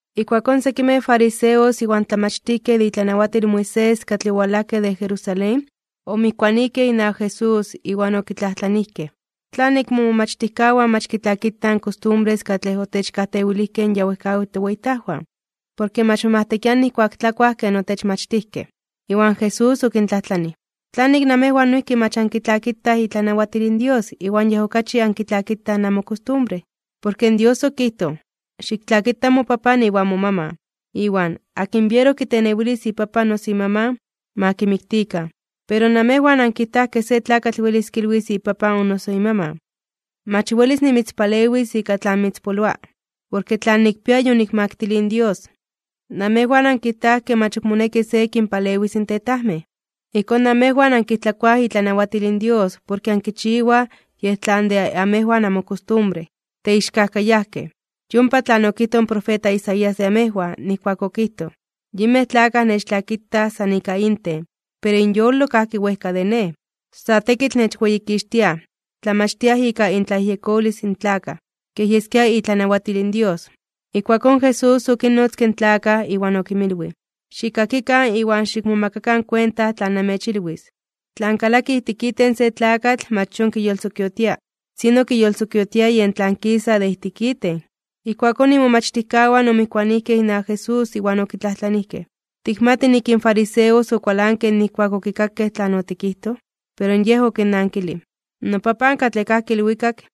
Ijkuakón sekimej fariseos iwan tlamachtijkej de itlanawatil in Moisés katlej owalajkej de Jerusalén, omijkuanijkej inawak Jesús, iwan okitlajtlanijkej: ―¿Tlanik momomachtijkawan mach kitlakitaj in kostumbres katlej otechkajtewilijkej in ya wejkawitl toweyitajwan? Porke mach momajtekiaj nijkuak tlakuaj ken otechmachtijkej. Iwan Jesús okintlajtlanij: ―¿Tlanik namejwan noijki mach ankitlakitaj itlanawatil in Dios iwan yej okachi ankitlakitaj namokostumbre? Porke in Dios okijtoj: “Xiktlakita mopapan iwan momaman”, iwan “Akin biero kitenewilis ipapan o noso imaman, ma kimiktikan.” Pero namejwan ankijtaj ke se tlakatl welis kilwis ipapan o noso imaman: “Mach welis nimitzpalewis ika tlan mitzpoloa, porke tlan nikpia yonikmaktilij in Dios.” Namejwan ankijtaj ke mach ok moneki se kinpalewis in tetajmej. Ijkón namejwan ankijtlakoaj itlanawatil in Dios porke ankichiwaj yej tlan de amejwan amokostumbre. ¡Teixkajkayajkej! Yompa tlan okijtoj in profeta Isaías de amejwan, nijkuak okijtoj: Yinmej tlakaj nechtlakitaj san ika inten, pero inyolo kajki wejka de Nej. San tekitl nechweyikixtiaj, tlamachtiaj ika intlayejyekolis in tlakaj kej yeskia itlanawatil in Dios. Ijkuakón Jesús okinnotzke in tlakaj, iwan okinmilwij: ―Xikkakikan iwan xikmomakakan kuenta tlan namechilwis: Tlan kalaki ijtik iten se tlakatl mach yon kiyolsokiotia. Sino kiyolsokiotia yen tlan kisa de ijtik iten. Ijkuakón imomachtijkawan omijkuanijkej inawak Jesús, iwan okitlajtlanijkej: ―¿Tikmati nik in fariseos okualankej nijkuak okikakej tlan otikijtoj? Pero Yej okinnankilij: ―NoPapan katlej kajki ilwikak,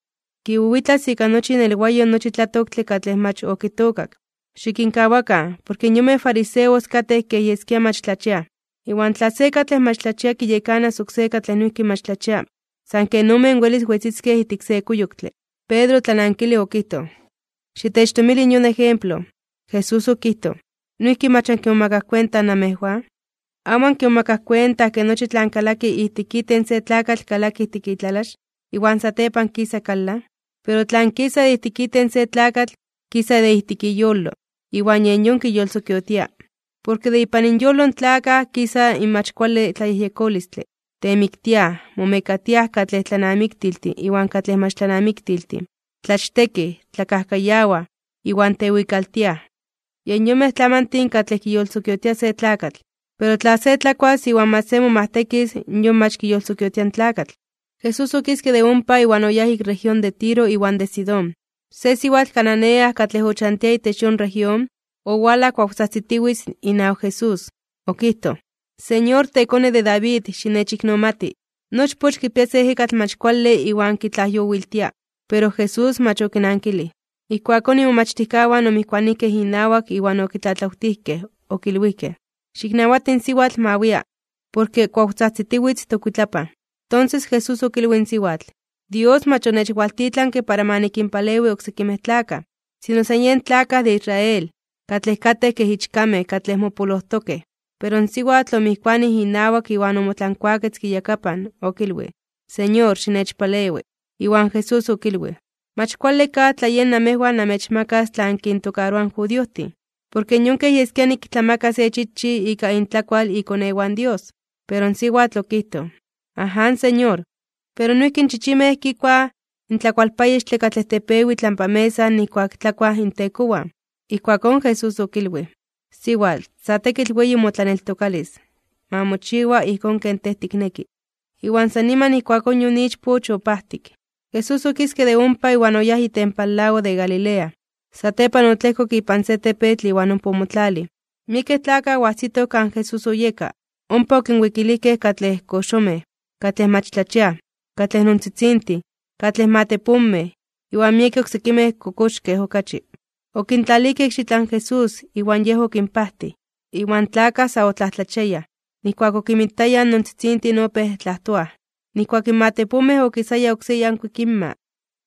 kiwiwitlas ika nochi inelwayo nochi tlatoktle katlej mach okitookak. Xikinkawakan. Porke in yonmej fariseos katej kej yeskia mach tlachiaj. Iwan tla se katlej mach tlachia kiyekanas oksé katlej noijki mach tlachia, san ken omen welis wetziskej ijtik se kuyoktle. Pedro otlanankilij okijtoj: ―Xitechtomili in yon ejemplo. Jesús okijtoj: ―¿Noijki mach ankimomakaj kuenta namejwan? ¿Amo ankimomakaj kuenta ke nochi tlan kalaki ijtik iten se tlakatl kalaki ijtik itlalax, iwan satepan kisa kalan? Pero tlan kisa de ijtik iten se tlakatl, kisa de ijtik iyolo. Iwan yen yon kiyolsokiotia. Porke de ipan inyolo in tlakaj kisa in mach kuale tlayejyekolistle, temiktiaj, momekatiaj katlej tlanamiktiltin iwan katlej mach tlanamiktiltin, tlachtekij, tlakajkayawaj, iwan tewikaltiaj. Yen yonmej tlamantin katlej kiyolsokiotia se tlakatl. Pero tla se tlakuas iwan mach se momajtekis, yon mach kiyolsokiotia in tlakatl. Jesús okiske de ompa iwan oyáj ik región de Tiro iwan de Sidón. Se siwatl cananea katlej ochantia itech yon región, owalaj kuawtzajtzitiwitz inawak Jesús. Okijtoj: ―¡Señor, tekone de David, xinechiknomati! Nochpoch kipia se ejekatl mach kuale iwan kitlajyowiltia. Pero Jesús mach okinankilij. Ijkuakón imomachtijkawan omijkuanijkej inawak iwan okitlatlawtijkej, okilwijkej: ―Xiknawati in siwatl ma wia, porke kuawtzajtzitiwitz tokuitlapan. Tonses Jesús okilwij in siwatl: ―Dios mach onechwaltitlanke para ma nikinpalewi oksekimej tlakaj, sino san yen tlakaj de Israel, katlej katej kej ichkamej katlej mopolojtokej. Pero in siwatl omijkuanij inawak iwan omotlankuaketzke iyakapan, okilwij: ―Señor, xinechpalewi. Iwan Jesús okilwij: ―Mach kuale kaj tla yej namejwan namechmakas tlan kintokaroa in judiojtin. Porke yon kej yeskia niktlamaka se chichij ika intlakual ikonewan in Dios. Pero in siwatl okijtoj: ―Aján, Señor. Pero noijki in chichimej kikuaj in tlakualpayextle katlej tepewi itlampa mesa nijkuak tlakuaj intekowan. Ijkuakón Jesús okilwij: ―Siwatl, sa tekitl weyi motlaneltokalis. Ma mochiwa ijkón ken tej tikneki. Iwan san niman ijkuakón yon ichpoch opajtik. Jesús okiske de ompa iwan oyáj itempan lago de Galilea. Satepan otlejkok ipan se tepetl iwan ompa omotlalij. Miekej tlakaj oajsitoj kan Jesús oyeka, ompa okinwikilijkej katlej koxomej, katlej mach tlachiaj, katlej nontzitzintin, katlej matepomej, iwan miekej oksekimej kokoxkej okachi. Okintlalijkej ikxitlan Jesús, iwan Yej okinpajtij. Iwan in tlakaj sa otlajtlachiayaj (omomajmawtiayaj), nijkuak okinmitayaj in nontzitzintin opéj tlajtoaj, nijkuak in matepomej okisaya oksé yankuik inma,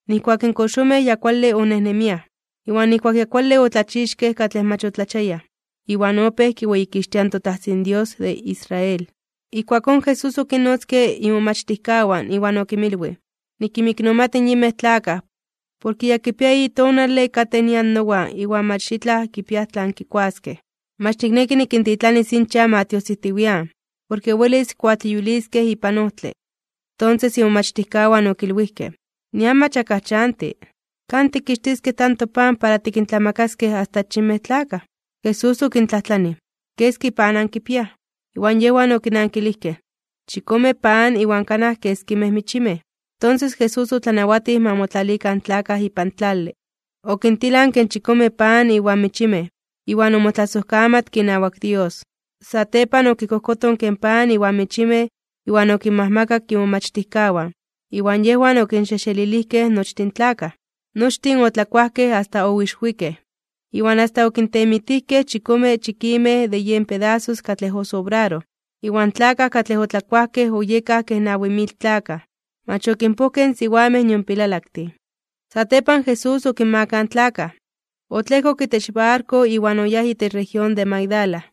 nijkuak in koxomej ya kuale onejnemiaj, iwan nijkuak ya kuale otlachixkej katlej mach otlachiayaj. Iwan opéj kiweyikixtiaj in toTajtzin Dios de Israel. Ijkuakón Jesús okinnotzke imomachtijkawan, iwan okinmilwij: ―Nikinmiknomati in yinmej tlakaj, porke ya kipia eyi tonale katej nian nowan iwan mach itlaj kipiaj tlan kikuaskej. Mach nikneki nikintitlanis inchan ma tiojsijtiwian, porke welis kuatleyuiliskej ipan ojtle. Tonses imomachtijkawan okilwijkej: ―Nian mach akaj chanti, ¿kan tikkixtiskej tanto pan para tikintlamakaskej asta achinmej tlakaj? Jesús okintlajtlanij: ―¿Keski pan ankipiaj? Iwan yejwan okinankilijkej: ―Chikome pan iwan kanaj keskimej michimej. Tonses Jesús otlanawatij ma motlalikan in tlakaj ipan tlale. Okintilanke in chikome pan iwan michimej, iwan omotlasojkamatke inawak Dios. Satepan okikojkotonke in pan iwan michimej iwan okinmajmakak in imomachtijkawan, iwan yejwan okinxejxelilijkej nochtin in tlakaj. Nochtin otlakuajkej asta oixwikej. Iwan asta okintemitijkej chikome chikimej de yen pedasos katlej osobraroj. Iwan tlakaj katlej otlakuajkej oyekaj kej nawi mil tlakaj, mach okinpojkej in siwamej nion pilalaktin. Satepan Jesús okinmakaj in tlakaj, otlejkok itech barko iwan oyáj itech región de Magdala.